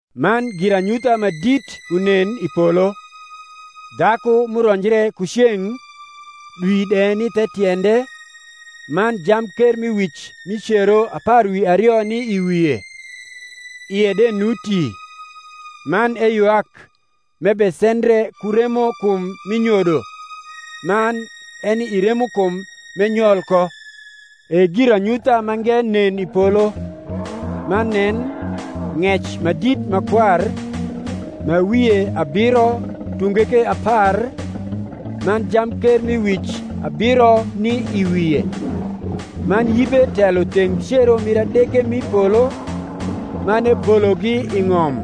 Man giranyutha ma dit unen i polo: dhaku m’uronjre ku ceng’, dwi de ni the tiende, man jamkermiwic mi cero apar wi ario ni i wie; ie de nuti; man eywak, m’ebesendre ku remokum mi nyodo, man eni i remokum m’enyol ko. E giranyutha mange nen i polo: man nen, ng’ec ma dit ma kwar, ma wie abiro tunge ke apar, man jamkermiwic abiro ni i wie. Man yibe telo theng cero mir adege m’i polo, man ebologi i ng’om: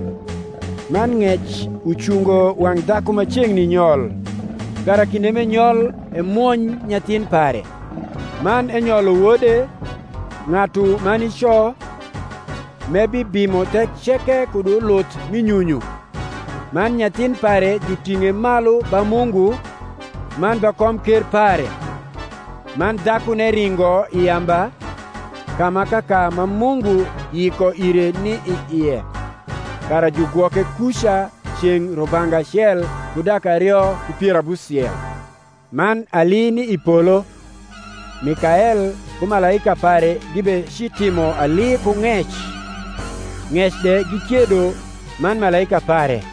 man ng’ec ucungo wang’ dhaku ma ceng’ni nyol, kara kinde m’enyol emwony nyathin pare. Man enyolo wode, ng’atu ma nico, m’ebibimo thek ceke kud uluth mi nyunyu: man nyathin pare juting’e malu ba Mungu, man ba komker pare. Man dhakune ringo i yamba, ka ma kaka ma Mungu yiko ire ni i ie, kara jugwoke kuca ceng’ rubanga acel ku dak ario ku pier abusiel. Man ali ni i polo: Mikael ku malaika pare gibecitimo ali ku ng’ec; ng’ec de gikiedo man malaika pare;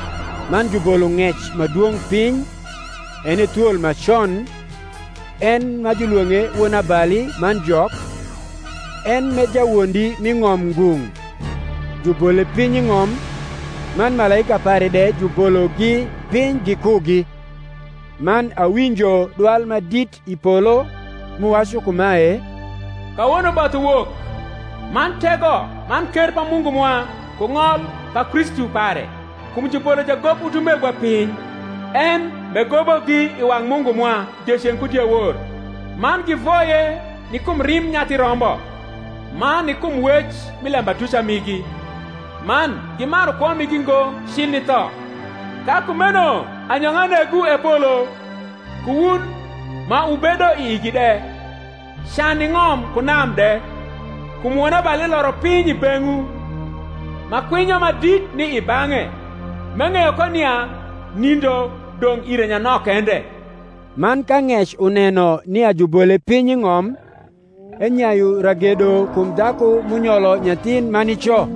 Man jubolo ng’ec ma dwong’ piny, en e thwol ma con, en ma julwong’e Wonabali man Jok, en m’e jawondi mi ng’om ngung’; jubole piny i ng’om, man malaika pare de jubologi piny gikugi. Man awinjo dwal ma dit i polo, m’uwacu kumae, Kawono both uwok, man tego man ker pa Mungu mwa, ku ng’ol pa Kristu pare: kum jubolo jagob utumegwa piny, en m’egobogi i wang’ Mungu mwa dieceng’ ku diewor. Man givoye ni kum rimb Nyathi Rombo, man ni kum wec mi lembatuca migi; man gimaru kwo migi ngo cil ni tho. Ka kumeno anyong’a negwu, E polo, ku wun ma wubedo i igi de. Can ni ng’om ku nam de: kum wonabali loro piny i beng’wu, ma kwinyo ma dit ni i bang’e, m’eng’eyo ko nia nindo dong’ ire nyanok kende. Man ka ng’ec uneno nia jubole piny i ng’om, enyayu ragedo kum dhaku m’unyolo nyathin ma nico.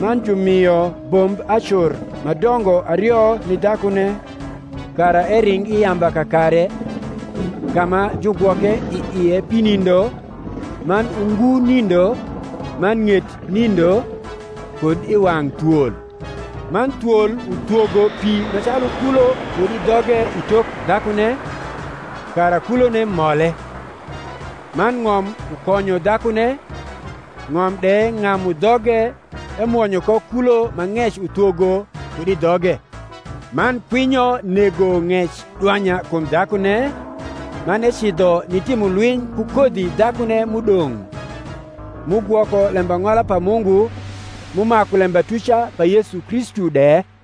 Man jumio bomb acur ma dongo ario ni dhakune, kara ering i yamba i kakare, ka ma jugwoke i ie pi nindo, man ungu nindo, man ng’et nindo, kud i wang’ thwol. Man thwol uthwogo pi ma calu kulo kud i dhoge i tok dhakune, kara kulone mole. Man ng’om ukonyo dhakune, ng’om de ng’amu dhoge emwonyo ko kulo ma ng’ec uthwogo kud i dhoge. Man kwinyo nego ng’ec dwanya kum dhakune, man ecidho nitimo lwiny ku kodhi dhakune m’udong’, m’ugwoko lembang’ola pa Mungu, m’umaku lembatuca pa Yesu Kristu de: